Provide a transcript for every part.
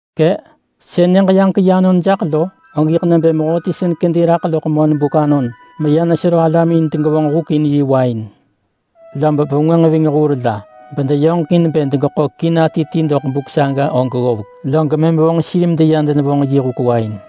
“Kë”! Sën Nyëġ-yaġek-yi anon jaḳ lo, og yiḳ nebë mehöti sën kedi raḳ loḳ monbuk anon meya nesero alam in degevonġ huk in yi wain. Lob vengwënġ ving hur la, bedeyoġekin bë degeḳo kina ti doḳ buk saga og ggovek, log mëm vonġ sir medeya denevonġ yi huk wain.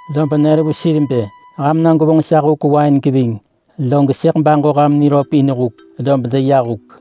Lob nër vu sir bë, ‘Ham na gwevonġ sa huk wain geving, log sëḳ baġo ham nivesa.’ Lob deya huk.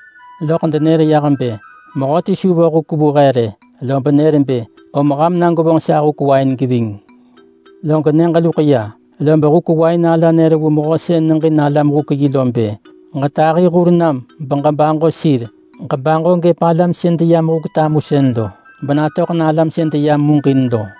Loḳ denër yah bë, ‘Huk main he!’ Lob nër bë, ‘Om ham na gwevonġ sa huk wain geving!’ Lob buk loḳ, lob huk wain ala nër vu mehö sën neġin alam huk yi lo bë, ‘Ġetahi hur nam beġebaġo sir. Ġebaġo gëp alam sën deyam huk tamusën lo, bena natöḳ na alam sën deyam muġin lo!’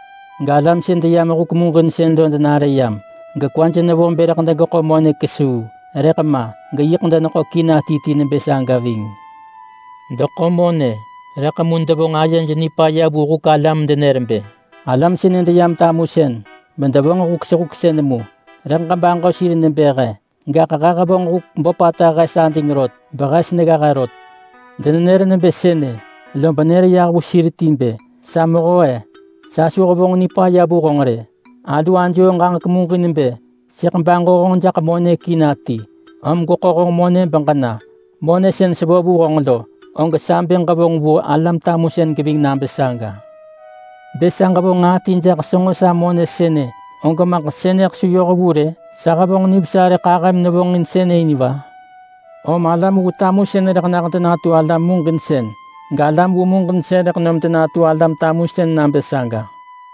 Galam sën deyam huk muġinsën lo denare yam, gekwaj nevo bë rëḳ degeḳo monë nġahiseḳë rot. Rëḳ ma! Yiḳ deneḳo kina ti ti nebë saga ving. Deḳo monë, rëḳ mu devonġ ayej nipaya vu huk ala medenër bë, ‘Alam sënë deyam tamusën, bedevonġ huk sehuksën mu, rëḳ ġebaġo sir nebë he. Gaḳ he nehevonġ huk böpata hes ading rot, behes negga he rot.’ Denenër nebë sënë, lob nër yah vu sir ti bë, ‘Sa mehö-e! Sa su hevonġ nipaya vu ham rë! Hil ajoo ġaġek muġin bë sëḳ baġo honġ jaḳ monë kina ti, om gweḳo honġ monë beġena. Monë sën sevo vu honġ lo, og sa bë ġevonġ vu alam tamusën geving nabë saga. Bë sa ġevonġ nġaa ti jaḳ senġo sa monë sënë, og maḳ sënë su yoh vu rë? Sa hevonġ nivesa rëḳ ahëm nevonġin sënë in va?’ Om alam vu tamusën rëḳ nah denatu alam muġinsën galam vu muġinsën rëḳ nom denatu alam tamusën nabë saga.”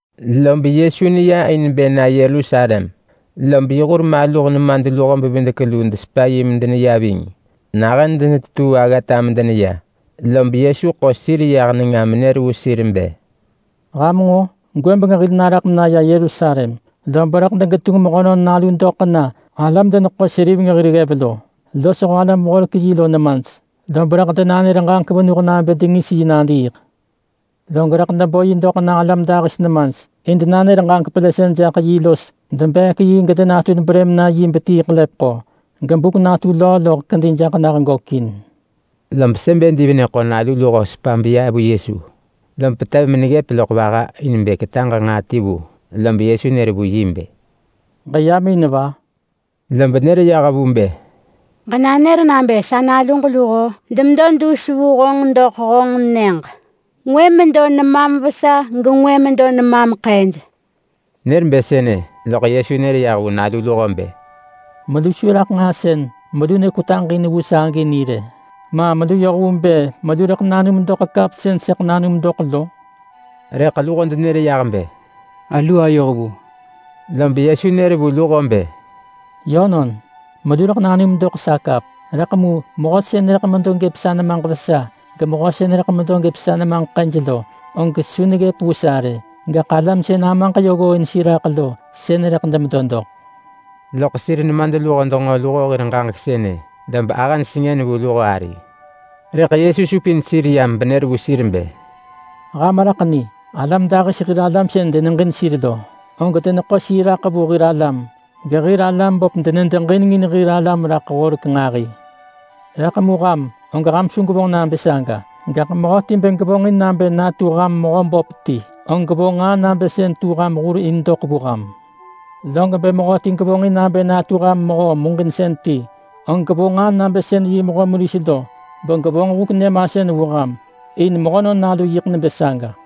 Lob Yesu neya in bë na Yerusalem, lob yi hur maluh nemadluho-bevidek-luu desepa yi medeneya ving. Nahën denetetuu aggata medeneya, lob Yesu ḳo sir yah nenga menër vu sir bë, “Ham nġo? Gwëbeng hil naraḳ menaya Yerusalem, lob rëḳ degetunġ Mehönon Nalu doḳ na alam-deneḳo-seriveng hir ggev lo los alam-horek-yi lo nemaj. Lob rëḳ denanër ġaġek venuh nabë dengis yi nadiiḳ. Log rëḳ debo yi doḳ na alam dahis nemaj, in denanër ġaġek pelësën jaḳ yi los debeek yi gedengis brëm na yi betii ḳelepeḳo. Gebuk natu löö loḳ kedi jaḳ nah gökin.” Lob Sebedi venë ḳo nalu luho sepa beya vu Yesu, lom petev meneggëp loḳ vaha in bë ketaġ nġaa ti vu. Lob Yesu nër vu yi bë, “Ġeyam in va?” Lob nër yah vu bë, “Ġenanër nabë sa naluġ luho denatu honġ ġadu gëp honġ Nyëġ. Ngwë medo gëp nemam vesa gengwë medo gëp nemam ḳëj.” Nër bë sënë, loḳ Yesu nër yah vu nalu luho bë, “Melu su raḳ nġaa sën melu nekwetaġ in vu sa agi ni rë. Ma melu yoh vu bë melu rëḳ nanum doḳ kap sën sëḳ nanum doḳ lo?” Rëḳ luho denër yah bë, “Alu ayoh vu!” Lob Yesu nër vu luho bë, “Yönon, melu rëḳ nanum doḳ sa kap! Rëḳ mu mehö sën rëḳ medo gëp sa nemaġ vesa gemehö sën rëḳ medo gëp sa nemaġ ḳëj lo, og su neggëp vu sa rë. Gaḳ alam sën Amaġ yö ggooin sir raḳ lo, sën rëḳ demedo doḳ.” Lob sir nemadluho denġo luho hir ġaġek sënë, lob ahëj sengën vu luho ari. Rëḳ Yesu supin sir yam benër vu sir bë, “Ham raḳ ni! Alam dahis hir alam sën deneġin sir lo, og deneḳo sir raḳ vu hir alam. Gehir alam böp denedeġinengin hir alam raḳ horek nġahi. Rëḳ mu ham, og ham su gwevonġ nabë saga! Gaḳ mehöti bë gevonġin nabë natu ham mehö böp ti, og gevonġ nġaa nabë sën tu ham hur in doḳ vu ham. Log bë mehöti gevonġin nabë natu ham mehö muġinsën ti, og gevonġ nġaa nabë sën yi mehö meris lo begevonġ huk nyëmasën vu ham. In Mehönon Nalu yiḳ nebë saga.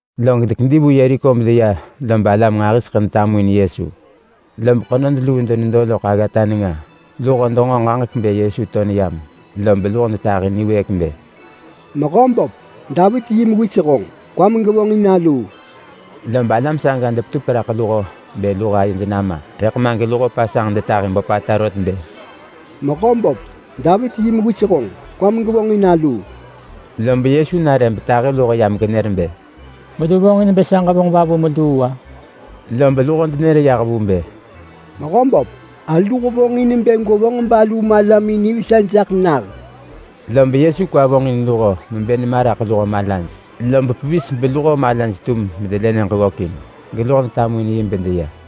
Log dekedi vu Yeriko bedeya lob alam nġahiseḳë detamuin Yesu. Lob mehö mala ḳenod luu denedo loḳ aggata nenga. Luho denġo ġaġek bë Yesu to neyam, lob luho detahi niwëëk bë, “Mehöböp, Davit yi Mewis honġ! Kwam gevonġin aluu!” Lob alam saga depetupek raḳ luho bë luho ayej nama, rëḳ ma geluho pasanġ detahi böpata rot bë, “Mehöböp! Davit yi Mewis honġ! Kwam gevonġin aluu!” Lob Yesu nare betahi luho benër bë, “Melu vonġin bë sa ġevonġ va vu meluu-a?” Lob luho denër yah vu bë, “Mehöböp, alu hevonġ in bë gwevonġ balu malamin nivesa jaḳ nah.” Lob Yesu kwa vonġin luho mebë nema raḳ luho malaj, lob pevis beluho malaj tum medelë nyëġ ggökin, geluho detamuin yi bedeya.